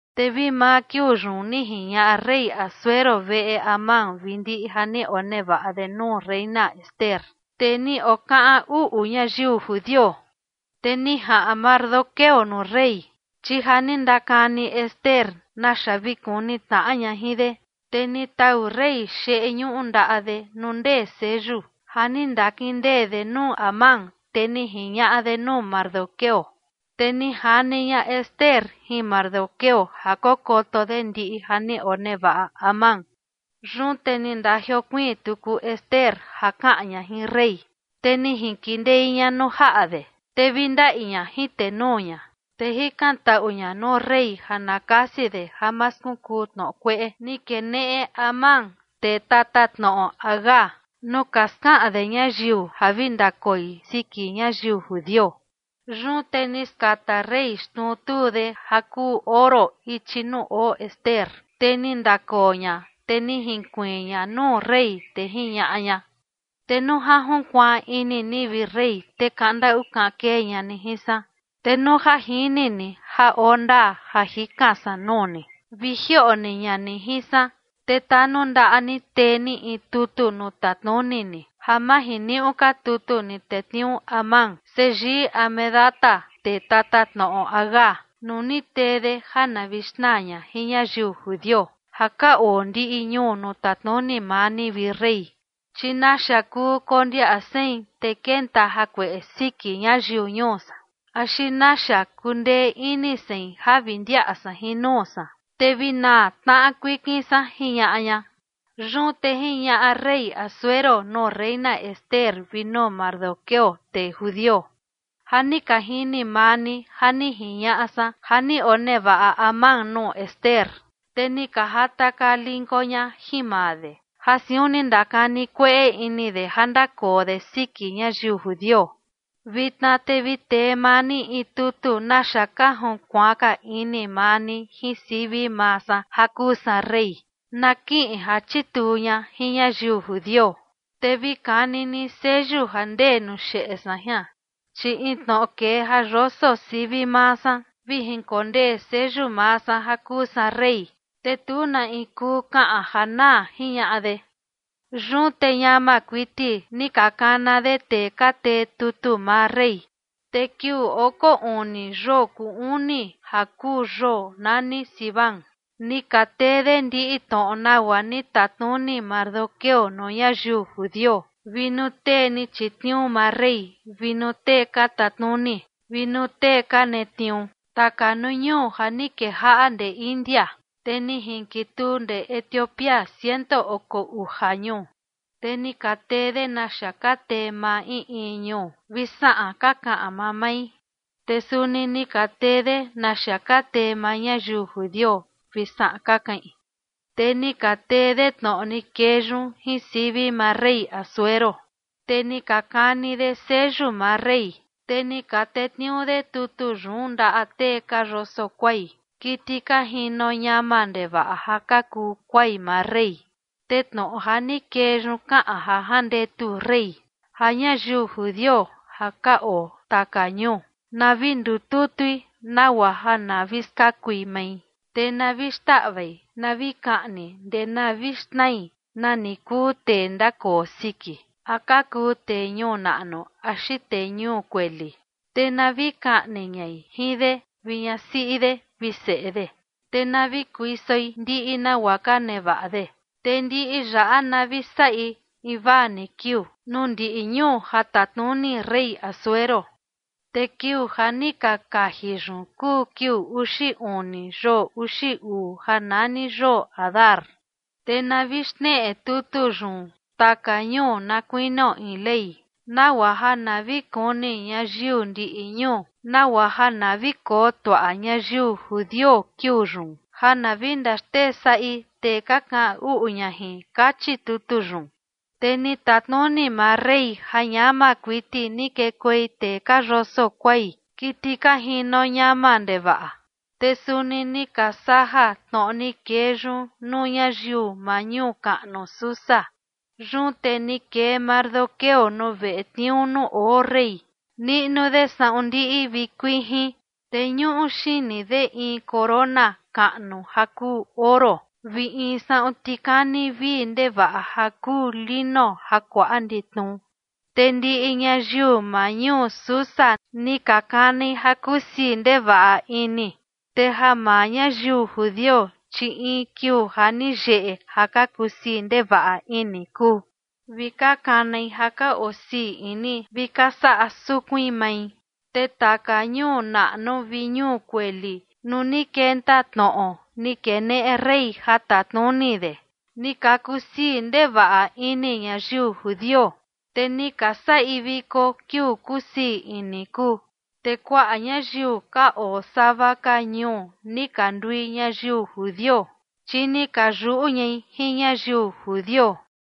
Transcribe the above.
Te vi maa kiuu yun ni jiñaꞌa rey Asuero veꞌe Amán vi ndiꞌi ja ni onevaꞌa de nuu reina Ester, tee ni okaꞌan uꞌu ñayiu judio. Te ni jaꞌan Mardoqueo nuu rey, chi ja ni ndakani Ester naxa vi kuni tnaꞌa ña jin de. Te ni tau rey xeꞌe ñuꞌu ndaꞌa de nuu ndee seyu ja ni ndakindee de nuu Amán, te ni jiñaꞌa de nuu Mardoqueo. Te ni jani ña Ester jin Mardoqueo ja kokoto de ndiꞌi ja ni onevaꞌa Amán. Yun te ni ndajiokuiin tuku Ester ja kaꞌan ña jin rey, te ni jinkindei ña nuu jaꞌa de, te vi ndaꞌi ña jin tenuu ña, te jikantaꞌu ña nuu rey ja na kasi de ja ma skunkuu tnoꞌo kueꞌe ni keneꞌe Amán, tee tatatnoꞌo Agag, nuu ka skaꞌan de ñayiu ja vi ndakoi siki ñayiu judio. Yun te ni skata rey xnuu tuu de ja kuu oro ichi nuu oo Ester, te ni ndakoo ña, te ni jinkuiin ña nuu rey, te jiñaꞌa ña: ―Te nuu ja junkuaan ini ni, vi rey, te kaꞌan ndaꞌu kaꞌan kee ña ni jin san, te nuu ja jini ni ja oo ndaa ja jikan san nuu ni, vi jioꞌo ni ña ni jin san, te tanundaꞌa ni tee ni in tutu nuu tatnuni ni ja ma jiniuꞌu ka tutu ni tetniuu Amán seyii Hamedata, tee tatatnoꞌo Agag, nuu ni tee de ja na vi xnaa ña jin ñayiu judio ja ka oo ndiꞌi ñuu nuu tatnuni maa ni, vi rey. Chi ¿naxa kuu kondiaꞌa sein te kenta jakueꞌe siki ñayiu ñuu san axi naxa kundee ini sein ja vi ndiaꞌa san jin nuu san, te vi naa tnaꞌa kuikin san? ―jiñaꞌa ña. Yun te jiñaꞌa rey Asuero nuu reina Ester vi nuu Mardoqueo, tee judio: ―Ja ni ka jini maa ni ja ni jiñaꞌa san ja ni onevaꞌa Amán nuu Ester, te ni ka jatakaa linko ña jin maa de, ja siun ni ndakani kueꞌe ini de ja ndakoo de siki ñayiu judio. Vitna te vi tee maa ni in tutu naxa ka junkuaan ka ini maa ni jin sivi maa san ja kuu san rey, na kiꞌin ja chituu ña jin ñayiu judio. Te vi kani ni seyu ja ndee nuu xeꞌe san jian, chi in tnoꞌo kee ja yoso sivi maa san vi jinkondee seyu maa san ja kuu san rey, te tu na in kuu kaꞌan ja naa ―jiñaꞌa de. Yun te ñama kuiti ni ka kana de tee ka tee tutu maa rey. Te kiuu oko uni yoo kuu uni ja kuu yoo nani Siván ni ka tee de ndiꞌi tnoꞌo nagua ni tatnuni Mardoqueo nuu ñayiu judio vi nuu tee ni chitniuu maa rey, vi nuu tee ka tatnuni, vi nuu tee ka netniuu taka nuu ñuu ja ni kejaꞌa ndee India, te ni jinkituu ndee Etiopía, ciento oko uja ñuu. Te ni ka tee de naxa ka tee maa in in ñuu, vi saꞌan ka kaꞌan mamai. Te suni ni ka tee de naxa ka tee maa ñayiu judio vi saꞌan ka kaꞌin. Te ni ka tee de tnoꞌo ni kee yun jin sivi maa rey Asuero, te ni ka kani de seyu maa rey, te ni ka tetniuu de tutu yun ndaꞌa tee ka yoso kuai, kiti ka jino ñama ndevaꞌa ja ka kuu kuai maa rey. Te tnoꞌo ja ni kee yun kaꞌan ja jandetu rey ja ñayiu judio ja ka oo taka ñuu, na vi ndututui nagua ja na vi skakui mai, te na vi xndaꞌvai na vi kaꞌni ndee na vi xnai, nani kuu tee ndakoo siki, a ka kuu tee ñuu naꞌnu axi tee ñuu kueli, te na vi kaꞌni ñai jin de vi ñasiꞌi de vi seꞌe de, te na vi kuisoi ndiꞌi nagua ka nevaꞌa de. Te ndiꞌi yaꞌa na vi saꞌi invaa ni kiuu nuu ndiꞌi ñuu ja tatnuni rey Asuero. Te kiuu ja ni ka kaji yun kuu kiuu uxi uni, yoo uxi uu ja nani yoo Adar. Te na vi xneꞌe tutu yun taka ñuu na kuinio in ley, nagua ja na vi kuni ñayiu ndiꞌi ñuu, nagua ja na vi koo tuaꞌa ñayiu judio kiuu yun ja na vi ndaxtee saꞌi tee ka kaꞌan uꞌu ña jin, kachi tutu yun. Te ni tatnuni maa rey ja ñama kuiti ni kekuei tee ka yoso kuai, kiti ka jino ñama ndevaꞌa. Te suni ni ka saja tnoꞌo ni kee yun nuu ñayiu maa ñuu kaꞌnu Susa. Yun te ni kee Mardoqueo nuu veꞌe tniuu nuu oo rey, niꞌnu de saꞌun ndiꞌi vi kuijin, te ñuꞌu xini de in corona kaꞌnu ja kuu oro vi in saꞌun tikani vii ndevaꞌa ja kuu lino ja kuaꞌa nditnu. Te ndiꞌi ñayiu maa ñuu Susa ni ka kanai ja kusii ndevaꞌa ini. Te ja maa ñayiu judio, chi in kiuu ja ni yeꞌe ja ka kusii ndevaꞌa ini kuu, vi ka kanai ja ka osii ini vi ka saꞌa sukuin mai. Te taka ñuu naꞌnu vi ñuu kueli nuu ni kenta tnoꞌo ni keneꞌe rey ja tatnuni de, ni ka kusii ndevaꞌa ini ñayiu judio, te ni ka saꞌi viko kiuu kusii ini kuu. Te kuaꞌa ñayiu ka oo sava ka ñuu ni ka ndui ñayiu judio, chi ni ka yuꞌu ñai jin ñayiu judio.